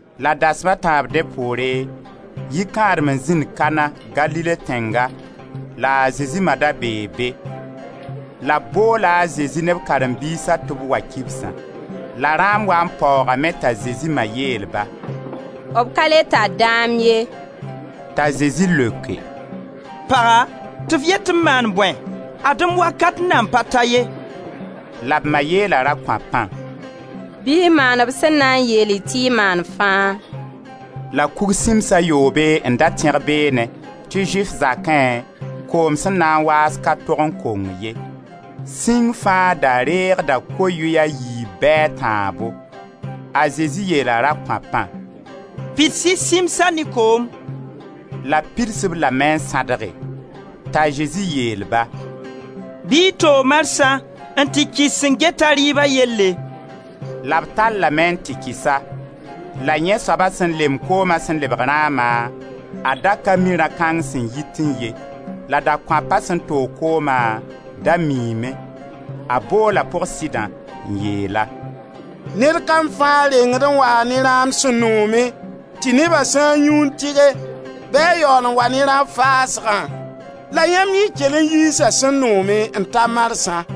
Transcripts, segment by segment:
La dasma a tãab dẽ poore, yikãadem n zĩnd Kana, Galile tẽnga, la a Zezi ma da bee be. La b boola a Zezi ne b karen-biisã tɩ b wa kibsã. La rãam waa n paoogame t'a Zezi ma yeel-ba: «B ka le tar dãam ye!» T'a Zezi leoke: «Paga, tɩ f yet tɩ m maan bõe? Ad-m wakat nan pa ta ye.» La b ma yeela rakõapã: «Bɩ y maan b sẽn na n yeel-y tɩ y maan fãa.» La kug sĩms a yoobe n da tẽg beenẽ, tɩ Zʋɩf zakẽ, koom sẽn na n waas ka tog n kong ye. Sĩng fãa da reegda ko-yʋy a yiib bɩ a tãabo. A Zezi yeela rakõapã: «Pids-y sĩmsa ne koom.» La b pids-b lame n sãdge. T'a Zezi yeel-ba: «Bɩ y toog marsã n tɩ kɩs sẽn geta rɩɩba yelle.» La b tallame n tɩ kɩs-a. La yẽ soaba sẽn lemb kooma sẽn lebg rãama — a da ka mi rã-kãng sẽn yitẽ ye, la dakõapa sẽn toog kooma, da miime — a boola pʋg-sɩdã, n yeel-a: «Ned kam fãa rengd n waa ne rãam sẽn noome tɩ neba sã n yũ n tɩge, bɩ a yaool n wa ne rã-faasgã, la yãmb yẽ kell n yiisa sẽn noome, n ta marsã!»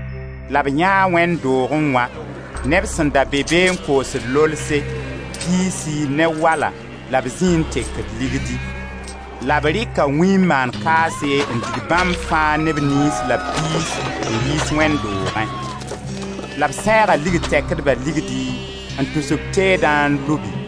La b yãee wẽnd doogẽ wã neb sẽn da be be n koosd lolse, piisi ne wala la b zĩi n tekd ligdi. La b rɩka wĩ n maan kaase n dig bãmb fãa ne b niis la b piis n yiis wẽnd doogẽ. La b sẽega ligd tɛkdba ligdi, n tus b teedã n lubi.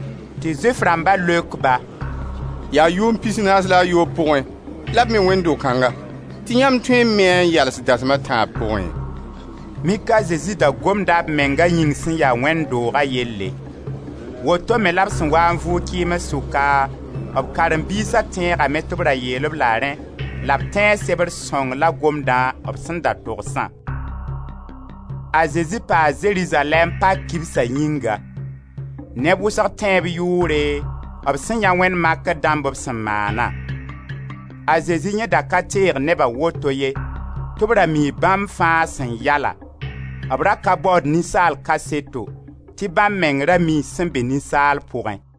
Tɩ Zʋɩf rãmba leok-ba: «Yaa yʋʋm pis naas la a yoob pʋgẽ la b me wẽnd do-kãnga tɩ yãmb tõe n me-a n yals dasma a tãab pʋgẽ?» Mik a Zezi da gomda b menga yĩng sẽn ya wẽnd dooga yelle. Woto me la b sẽn waa n vʋʋg kɩɩms sʋka, b karen-biisa tẽegame tɩ b ra yeel-b la rẽ la b tẽe sebr sõng la gomdã b sẽn da togsã. A Zezi paa Zerizalɛɛm pak kibsa yĩnga. Neb wʋsg tẽ b yʋʋre, b sẽn yãe wẽnd makr dãmb b sẽn maana. A Zezi yẽ da ka teeg neba woto ye, tɩ b ra mii bãmb fãa sẽn ya-la, b ra ka baood ninsaal kaseto, tɩ bãmb meng ra mii sẽn be ninsaal pʋgẽ.